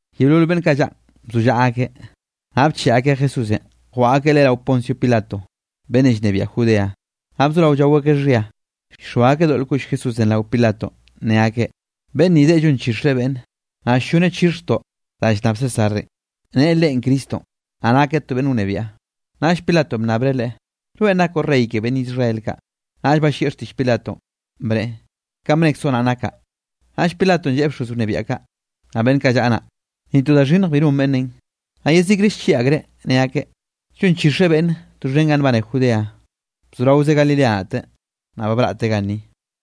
Yeolol beꞌnn kaꞌ llaꞌn bzollaꞌa akeꞌ, naꞌ bcheꞌe akeꞌ Jesúsenꞌ jwaꞌa akeꞌ Leꞌe rao Poncio Pilato, beꞌnnenꞌ llnebiaꞌ Judea. Naꞌ bzorao llao akeꞌ xhia, llxoa akeꞌ doꞌl koꞌll Jesúsenꞌ rao Pilatonꞌ, ne akeꞌ: —Beꞌnn ni deꞌe llonchixreꞌ beꞌnne, naꞌ ll-lloneꞌ chixhjtoꞌ danꞌ llnnab Césarenꞌ, neꞌe leꞌen Cristonꞌ, naꞌ nakeꞌ to beꞌnn wnebiaꞌ. Naꞌll Pilatonꞌ bnnabreꞌ Leꞌe: —¿Rweꞌn nakoꞌ Rey ke beꞌnn Israel kaꞌ? Naꞌll ballieꞌ xtiꞌll Pilatonꞌ, bneꞌe: —Kanꞌ bnekzoꞌ naꞌ nakaꞌ. Naꞌll Pilatonꞌ lleꞌe bxoz wnebiaꞌ kaꞌ, naꞌ beꞌnn kaꞌ llaꞌa naꞌ: —Ni to da xhinnj bi non beꞌnnenꞌ. Naꞌ yezikre llchieꞌ akreꞌ, ne akeꞌ: —Llonchixreꞌ beꞌnne doxhen ganꞌ nbane Judea, bzoraozeꞌ Galilea naꞌte, naꞌ ba braꞌte ganni.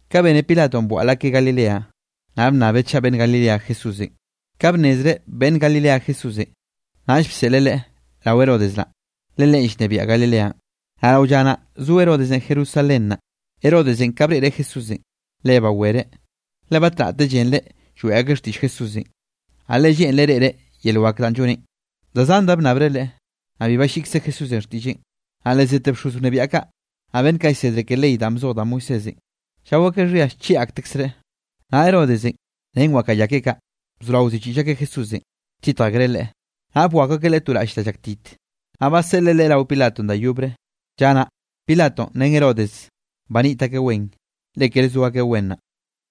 Ka bene Pilatonꞌ bwaꞌl akeꞌ Galilea, naꞌ bnnabeꞌ chaꞌ beꞌnn Galilea Jesúsenꞌ. Ka bnnezreꞌ beꞌnn Galilea Jesúsenꞌ, naꞌll bseꞌleꞌ Leꞌe rao Herodes naꞌ, le leꞌen llnebiaꞌ Galileanꞌ, naꞌ rao lla naꞌ zo Herodes, Jerusalén naꞌ. Herodesenꞌ ka breꞌreꞌ Jesúsenꞌ, le bawereꞌ, le batnaꞌte llenreꞌ lloeꞌ akeꞌ xtiꞌll Jesúsenꞌ, naꞌ le lleꞌnreꞌ reꞌreꞌ yel wak danꞌ lloneꞌn. Da zan da bnnabreꞌ Leꞌe, naꞌ bi balliꞌkze Jesúsenꞌ xtiꞌlleꞌn. Naꞌ le zete bxoz wnebiaꞌ kaꞌ, naꞌ beꞌnn kaꞌ llsedre ke ley danꞌ bzoj da Moisésenꞌ, llao akeꞌ xhia llchieꞌ aktekzreꞌ. Naꞌ Herodesenꞌ ren wakaꞌa ya keꞌe kaꞌ, bzorao ziꞌchiꞌll akeꞌ Jesúsenꞌ, lltitj akreꞌ Leꞌe. Naꞌ bwakw akeꞌ Leꞌe to raꞌll da llaktit, naꞌ baseꞌleꞌ Leꞌe rao Pilatonꞌ da yobre. Lla naꞌ, Pilatonꞌ ren Herodes baniꞌt akeꞌ wen, le kere zo akeꞌ wen naꞌ.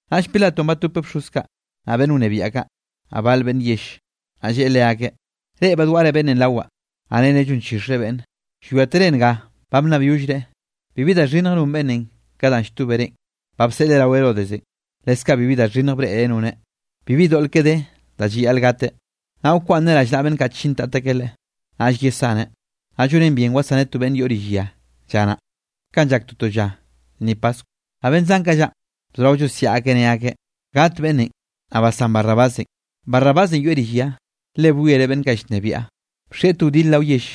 Naꞌll Pilatonꞌ batopeꞌ bxoz kaꞌ, naꞌ beꞌnn wnebiaꞌ kaꞌ, naꞌ bal beꞌnn yell. Naꞌ lleꞌe leakeꞌ: —Reꞌ badwaꞌre beꞌnnenꞌ rawaꞌ, naꞌ nere llonchixreꞌ beꞌnne. Llwiátere nga ba bnnabyollreꞌ, bibi da xhinnj non beꞌnnenꞌ ka danꞌ lltóberenꞌ. Ba bseꞌleꞌ rao Herodesenꞌ, leskaꞌ bibi da xhinnj breꞌreꞌ noneꞌ, bibi doꞌl keꞌe de, da llayaꞌl gateꞌ. Naꞌ wkwaꞌnneꞌ rallnaꞌa beꞌnn kaꞌ chintat akeꞌ Leꞌe, naꞌll yesaneꞌ. Naꞌ llonen bien wsaneꞌ to beꞌnne yoꞌ rill ya lla naꞌ, kanꞌ llak toto lla lnni paskw. Naꞌ beꞌnn zan kaꞌ llaꞌn, bzorao llosiaꞌ akeꞌ ne akeꞌ: —¡Gat beꞌnnenꞌ, naꞌ basán Barrabásenꞌ! Barrabásenꞌ yoeꞌ rill ya, le bwiereꞌ beꞌnn kaꞌ llnebiaꞌ, bxieꞌ to wdil rao yell,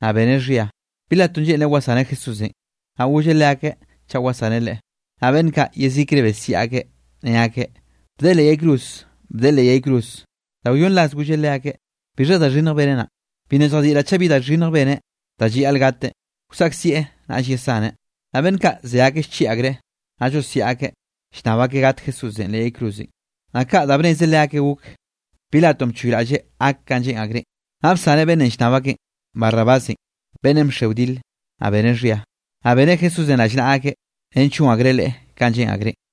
naꞌ beneꞌ xhia. Pilatonꞌ lleꞌnreꞌ wsaneꞌ Jesúsenꞌ, naꞌ golleꞌ leakeꞌ chaꞌ wsaneꞌ Leꞌe. Naꞌ beꞌnn kaꞌ, yezikre besiaꞌ akeꞌ, ne akeꞌ: —¡Bdeꞌe leꞌ yay cruz! ¡Bdeꞌe leꞌ yay cruz! Da wyonn ras golleꞌ leakeꞌ: —¿Bixha da xhinnj beneꞌ naꞌn? Bi nna lljadiꞌraꞌ chaꞌ bi da xhinnj beneꞌ da llayaꞌl gateꞌ. Wsaꞌkzieꞌ, naꞌll yesaneꞌ. Naꞌ beꞌnn kaꞌ ze akeꞌ llchieꞌ akreꞌ, naꞌ llosiaꞌ akeꞌ llnnab akeꞌ gat Jesúsenꞌ leꞌ yay cruzenꞌ, naꞌ kaꞌ da bnez leakeꞌ gok. Pilatonꞌ bchoyraꞌlleꞌ gak kanꞌ lleꞌn akreꞌn. Naꞌ bsaneꞌ beꞌnnenꞌ llnnab akeꞌn, Barrabásenꞌ, beꞌnnenꞌ bxe wdil, naꞌ beneꞌ xhia. Naꞌ beneꞌ Jesúsenꞌ rallnaꞌa akeꞌ, nench gon akreꞌ Leꞌe kanꞌ lleꞌn akreꞌn.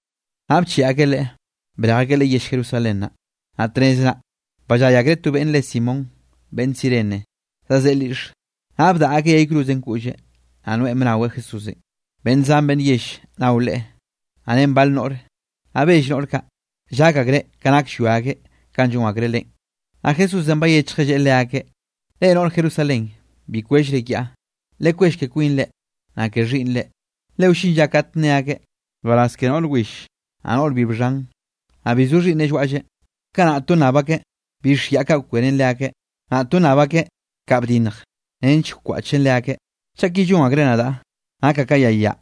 Naꞌ bcheꞌe akeꞌ Leꞌe, brej akeꞌ Leꞌe yell Jerusalén naꞌ, naꞌ tnez naꞌ, ballay akreꞌ to beꞌnn re Simón beꞌnn Cirene zazeꞌe lyiꞌxe, naꞌ bdaꞌa akeꞌ yay cruzenꞌ koꞌlleꞌ, naꞌ noeꞌn bnaweꞌ Jesúsenꞌ. Beꞌnn zan beꞌnn yell nao Leꞌe, naꞌ ren bal noꞌre. Naꞌ bell noꞌr kaꞌ, llak akreꞌ ke nak llwia akeꞌ kanꞌ llon akreꞌ Leꞌen. Naꞌ Jesúsenꞌ bayechjeꞌ, lleꞌe leakeꞌ: —Reꞌ noꞌr Jerusalén, bi kwellre kiaꞌ, lekwell ke kwinre, naꞌ ke xhiꞌnnre. Le wllin lla kate nne akeꞌ: “Nbaraz ke noꞌr will, naꞌ noꞌr bi bxhan, naꞌ bi zo xhiꞌnneꞌ llwaꞌlleꞌ.” Kanaꞌ to nnab akeꞌ bix yaꞌ kaꞌ kwenen leakeꞌ, naꞌ to nnab akeꞌ kaꞌ bdinnj nench kwaꞌchen leakeꞌ. Chaꞌ ki llon akreꞌ nadaꞌ, nakaꞌ ka yay yaꞌ,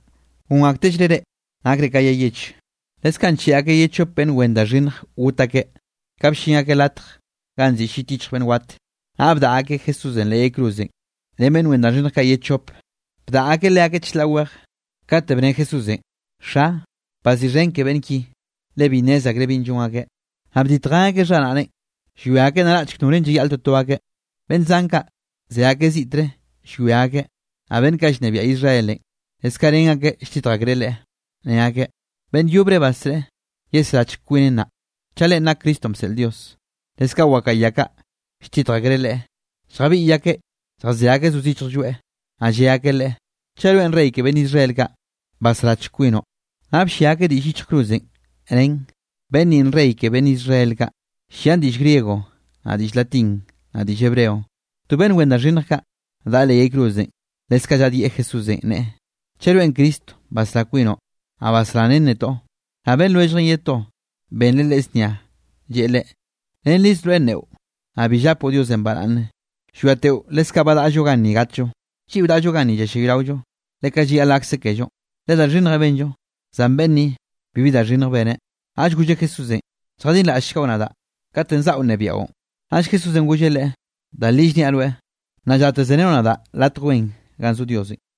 gon aktellreꞌ reꞌ, nakre ka yay yeche. Leskaꞌ ncheꞌe akeꞌ ye chop beꞌnn wen da xhinnj got akeꞌ. Ka bllin akeꞌ latj ganꞌ nziꞌi Llit Yichj Beꞌnn Wat, naꞌ bdaꞌa akeꞌ Jesúsenꞌ leꞌ yay cruzenꞌ, ren beꞌnn wen da xhinnj kaꞌ ye chope, bdaꞌa akeꞌ leakeꞌ chlaꞌ weje. Kate bne Jesúsenꞌ: —Xa, bxhiꞌxhen ke beꞌnn ki, le bi nnez akreꞌ binꞌ llon akeꞌ. Naꞌ bditjen akeꞌ xharaꞌneꞌn, llwia akeꞌ naraꞌchk norenꞌ llayaꞌl toto akeꞌ. Beꞌnn zan kaꞌ, ze akeꞌ ziꞌtre llwia akeꞌ, naꞌ beꞌnn kaꞌ llnebiaꞌ Israelenꞌ, leskaꞌ ren akeꞌ lltitj akreꞌ Leꞌe, ne akeꞌ: —Beꞌnn yobre basreꞌe, yesrachke kwineꞌ nnaꞌ, chaꞌ leꞌen nak Cristonꞌ bseꞌl Dios. Leskaꞌ wakaꞌa ya kaꞌ, lltitj akreꞌ Leꞌe, lljabiꞌy akeꞌ lljazé akeꞌ zo zichj lloeꞌ, naꞌ lleꞌ akeꞌ Leꞌe: —¡Chaꞌ rweꞌn Rey ke beꞌnn Israel kaꞌ, basrachk kwinoꞌ! Naꞌ bllia akeꞌ diꞌll yichj cruzenꞌ, nen: “Beꞌnn ninꞌ Rey ke beꞌnn Israel kaꞌ.” Llian diꞌll griego, naꞌ diꞌll latín, naꞌ diꞌll hebreo. To beꞌnn wen da xhinnj kaꞌ, daꞌa leꞌ yay cruzenꞌ, leskaꞌ llaꞌdyieꞌ Jesúsenꞌ, neꞌe: —¡Chaꞌ rweꞌn Cristonꞌ basrá kwinoꞌ, naꞌ basrá ren netoꞌ! Naꞌ beꞌnn lwelljeꞌn ye to, benreꞌ leꞌe znia, lleꞌe leꞌe: —Rennriz rweꞌ nneꞌo, naꞌ bi llapoꞌ Diosenꞌ baraꞌnne, llwiateꞌo leskaꞌn ba daꞌllo ganni gatllo. Lliꞌo daꞌllo ganni llallayraollo, le kaꞌ llayaꞌl gakse kellonꞌ, le da xhinnjenꞌ benllo, zan beꞌnn ni, bibi da xhinnj beneꞌ. Naꞌll golleꞌ Jesúsenꞌ: —Lljadinraꞌllchgoꞌ nadaꞌ katenꞌ zaꞌo nnebiaꞌon. Naꞌll Jesúsenꞌ golleꞌ leꞌe: —Da li llniaꞌ rweꞌ, nnaꞌ llate serenoꞌ nadaꞌ latj wen ganꞌ zo Diosenꞌ.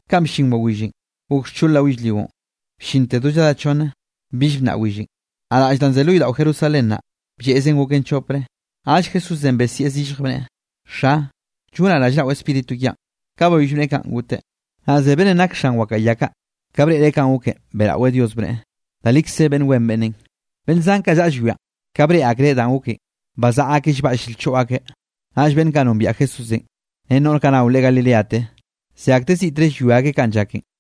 Kanꞌ bllin wawillenꞌ, gok xchol rao yellrionꞌ bllinte do lladá chonne. Bill bnnaꞌ willenꞌ, naꞌ raꞌll danꞌ ze lo yodaꞌo Jerusalén naꞌ, blleꞌzen goken chopre. Naꞌll Jesúsenꞌ besieꞌ zillj, bneꞌe: —Xa, llonaꞌ rallnaꞌo Spíritu kiaꞌn. Ka bayoll bneꞌe kaꞌn, goteꞌ. Naꞌ ze beꞌnnenꞌ nak xan wakaꞌa ya kaꞌ, ka breꞌreꞌ kanꞌ goken, beꞌraweꞌ Dios bneꞌe: —Da likze beꞌnn wen beꞌnnenꞌ. Beꞌnn zan kaꞌ llaꞌa llwianꞌ, ka breꞌe akreꞌ danꞌ goken, bazaꞌa akeꞌ llbaꞌll lchoꞌ akeꞌ. Naꞌll beꞌnn kaꞌ nombiaꞌ Jesúsenꞌ, ren noꞌr kaꞌ nao Leꞌen Galileate, ze akteꞌ ziꞌtre llwia akeꞌ kanꞌ llaken.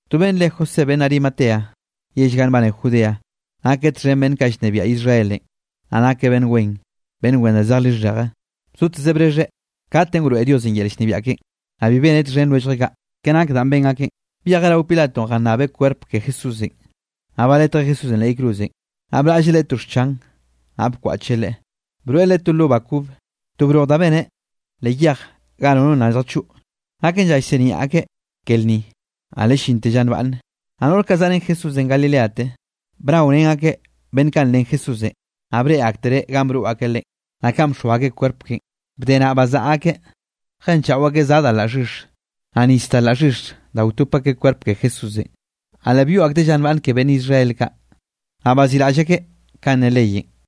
To beꞌnn re José beꞌnn Arimatea, yell ga nbane Judea, nakeꞌ txhen beꞌnn kaꞌ llnebiaꞌ Israelenꞌ, naꞌ nakeꞌ beꞌnn wen, beꞌnn wen da zej lixheje. Bzotezeꞌ brexheꞌ katenꞌ wroeꞌ Diosenꞌ yel llnebiaꞌ keꞌen, naꞌ bi beneꞌ txhen lwelljeꞌ kaꞌ, ke nak danꞌ ben akeꞌn. Byejeꞌ rao Pilatonꞌ jannabeꞌ kwerp ke Jesúsenꞌ. Naꞌ baletjeꞌ Jesúsenꞌ leꞌ yay cruzenꞌ, naꞌ braꞌlleꞌ Leꞌe to xchan, naꞌ bkwaꞌcheꞌ Leꞌe. Broeꞌ Leꞌe to lo ba kob, to broj da beneꞌ leꞌ yej ga nono nna lljachoꞌ. Naken lla llsiniaꞌ akeꞌ ke lnninꞌ, naꞌ le llinte lla nbaꞌnne. Naꞌ noꞌr kaꞌ zaꞌa ren Jesúsenꞌ Galileate, bnaorén akeꞌ beꞌnn kaꞌ nlen Jesúsenꞌ, naꞌ breꞌe aktereꞌ ganꞌ broꞌ akeꞌ Leꞌen, naꞌ kanꞌ bxoa akeꞌ kwerp keꞌen. Bde naꞌ, bazaꞌa akeꞌ jenchaꞌo akeꞌ za da la xhix, naꞌ nis da la xhix da wtop akeꞌ kwerp ke Jesúsenꞌ. Naꞌ le byoꞌ akteꞌ lla nbane ke beꞌnn Israel kaꞌ, naꞌ baziꞌraꞌll akeꞌ kanꞌ ne leyenꞌ.